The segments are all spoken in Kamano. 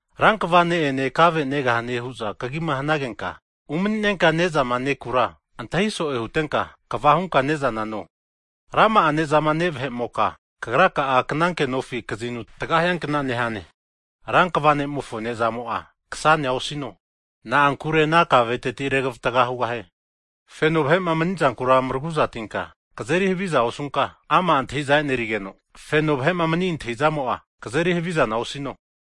Rankva ne'ene kave negahane hu'za kagima hanagenka umani'nenka nezama nekura, antahi so'e hutenka kva hunka ne'zana no. Rama'a ne'zama ne' vahe'moka, kagraka'a knankenofi kazinuti taga hiankna nehane. Rankva ne'mofo ne'zamo'a, ksanea osino. Na'ankure ana kaveteti, regavatga hugahie. Feno vahe'ma mni'zankura maragu'zatinka kazeri havizana osunka, ama' antahiza e'nerigeno feno vahe'ma mani antahizamo'a kazeri havizana osino.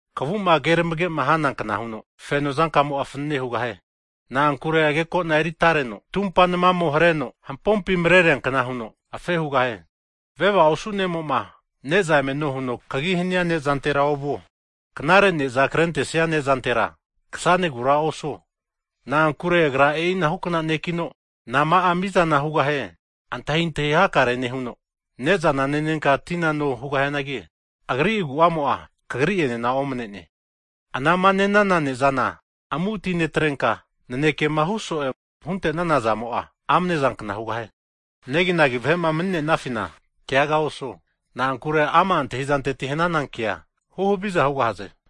Kavuma keramage'ma hanankna huno, feno zankamo'a fanane hugahie. Na'ankure agekona eri atareno tumpa namamo hareno hampompi mareriankna huno, afe hugahie. Veva osu ne'mo'ma ne'za emeno huno kagi hania nezantera ovuo. Knare ne'za krentesia nezantera, ksanegura osuo. Na'ankure agra e'inahukna ne'kino, nama'a mizana hugahie antahintahi hakare nehuno, ne'zana nenenka tina no hugahianagi, agri agu'amo'a, kagri'enena omane'ne. Anama ne'nana nezana amu'atinetrenka, nanekema hu so'e huntenana zamo'a, amanezankna hugahie. Neginagi vahe'ma mani'nenafina keaga osuo, na'ankure ama' antahizanteti hanana kea, huhaviza hugahaze.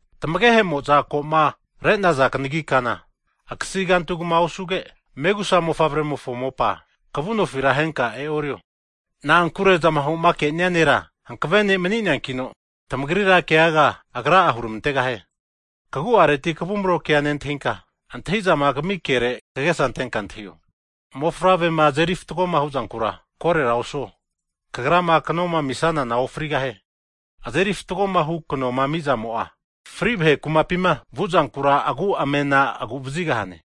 Tamagehe'mo'za koma re'ne'naza kanagi kana akasi kantugma osuge, megusa mofavre'mofo mopa kavunofi ahenka e'orio. Na'ankure zamahoma ke'nia Nera hankave Ne' mani'neankino, tamagrira keaga Agra'a hurmantegahie. Kagu'areti kavumro kea nentahinka, antahizama kami kere kagesa antenka antahio. Mofavrema azeri fatgoma huzankura, korera osuo. Kagrama knoma amisanana ofrigahie. Azeri fatgo hu knoma amizamo'a, fri vahe kumapima vuzankura agu amena agu'vazigahane.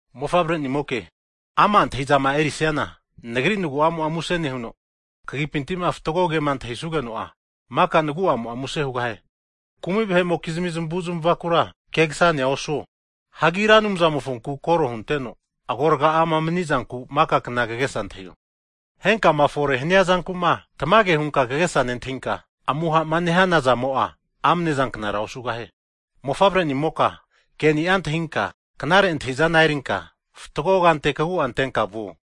Mofavre'nimoke, ama' antahizama erisiana, Nagri nagu'amo'a muse nehuno, kagipinti'ma fatgo ke'ma antahi'sugeno'a, mika nagu'amo'a muse hugahie. Kumi vahe'mokizmi zamavu'zmavakura kegasanea osuo. Hianagi Ra Anumzamofonku kore'ma hunteno agorga'ama manizanku maka kna, kagesa antahio. Henkama fore hania zankuma tamage hunka kagesa nentahinka, amuhama nehana zamo'a amnezanknara osugahie. Mofavre'nimoka, ke'ni'a antahinka knare antahi'zana erinka, fatgo kante kagu'a antenka vuo.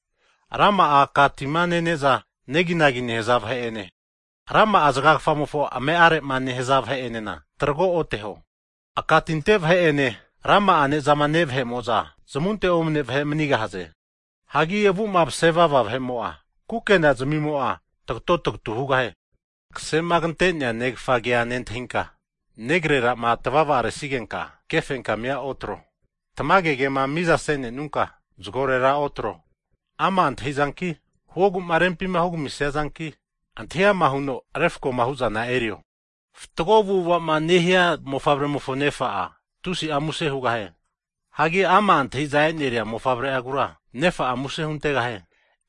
Rama'a aka'tima nene'za neginagi nehaza vahe'ene, rama'a zgagfamofo ame'are'ma nehaza vahe'enena, trago oteho. Aka tinte vahe'ene ra'ma'a nezama ne' vahe'mo'za, zmunte omne vahe manigahaze. Hagi avu'ma mase vava vahe'mo'a, kukena zamimo'a tagato tagatu hugahie. Kasema kante'nea negafa ke'a nentahinka, negrerama tvavaresigenka kefenkamia otro. Tamage ke'ma mizase'nenunka zgorera otro, ama' antahizanki, huoguma rempima hugamisiazanki, antahi'ama huno refkoma hu'zana erio. Fatgo avu'avama nehia mofavremofo nefa'a, tusi'a muse hugahie. Hagi ama' antahiza eri'nea mofavre'agura, nefa'a muse huntegahie.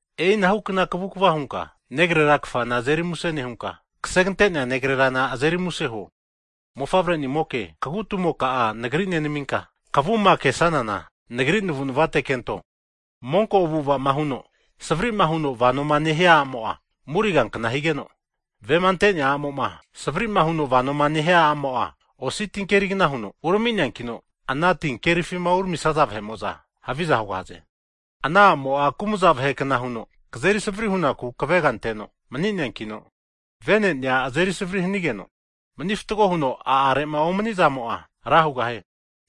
E'inahu kavukva hunka negrera kfama azeri muse nehunka, ksegante'nea negrerana azeri muse huo. Mofavre'nimoke, kagu'tumoka'a Nagri nenaminka, kvuma ke'sanana, Nagri navu'navate kento. Monko avu'avama huno Savrima huno vanoma nehia a'mo'a, murigankna higeno, vema ante'nea a'mo'ma savrima huno vanoma nehia a'mo'a, osi tinkerigna huno urami'neankino, ana tinkerifima uramisaza vahe'mo'za haviza hugahaze. Ana a'mo'a kumza vahe'kna huno kazeri savri hunaku kaveganteno mni'neankino, venenea azeri savri hanigeno, mani fatgo huno a'are'ma omani'zamo'a ra hugahie.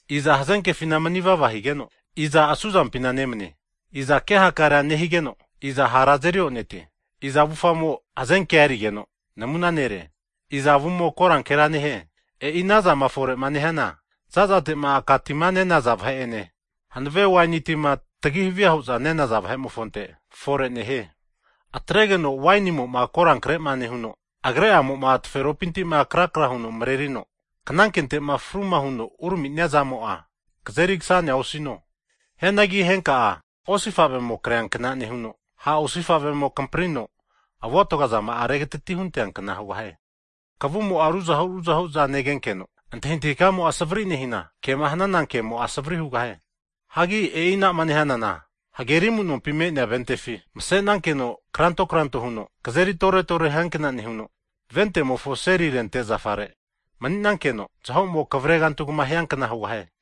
Iza hazenkefina mni'vava higeno, iza asu zampina nemanie? Iza ke hakarea nehigeno, iza hara azeri o'netie? Iza avufamo hazenkea erigeno namuna nere? Iza avumo korankera nehie? E'i anazama fore'ma nehiana zazate'ma aka tima nenaza vahe'ene, hanave waini tima tagi havia hu'za ne'naza vahe'tmimofonte fore nehie. Atregeno wainimo'ma korankrema nehuno, agrema'amo taferopinti krakra huno mrenerino, knankente'ma fruma huno urami'nia zamo'a, kazeri kasanea osino. Hianagi henka'a hamu osifavemo kreankna nehuno, ha' osifavemo kamprino avuatgazama'a regatati huganteankna hugahie. Kavumo'a ruzahu ruzahu'za negenkeno, antahintahi kamo'a savri nehina, kema hanana kemo'a savri hugahie. Hagi e'inama nehanana, hageri amunompi me'nea ventefi masenankeno kranto kranto huno kazeri tore tore hiankna nehuno, ventemofo seri rente zafare mani'nankeno, zahomo kavregantugama hiankna hugahane.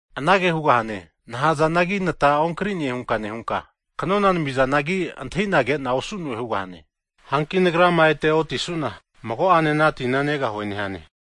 Anage hugahane, nahazanagi nata onkrine hunka nehunka, kanona namizanagi antahina kena osu'no'e hugahane. Hanki nagrama ete otisuna, mago'ane ana tina negahue nehane.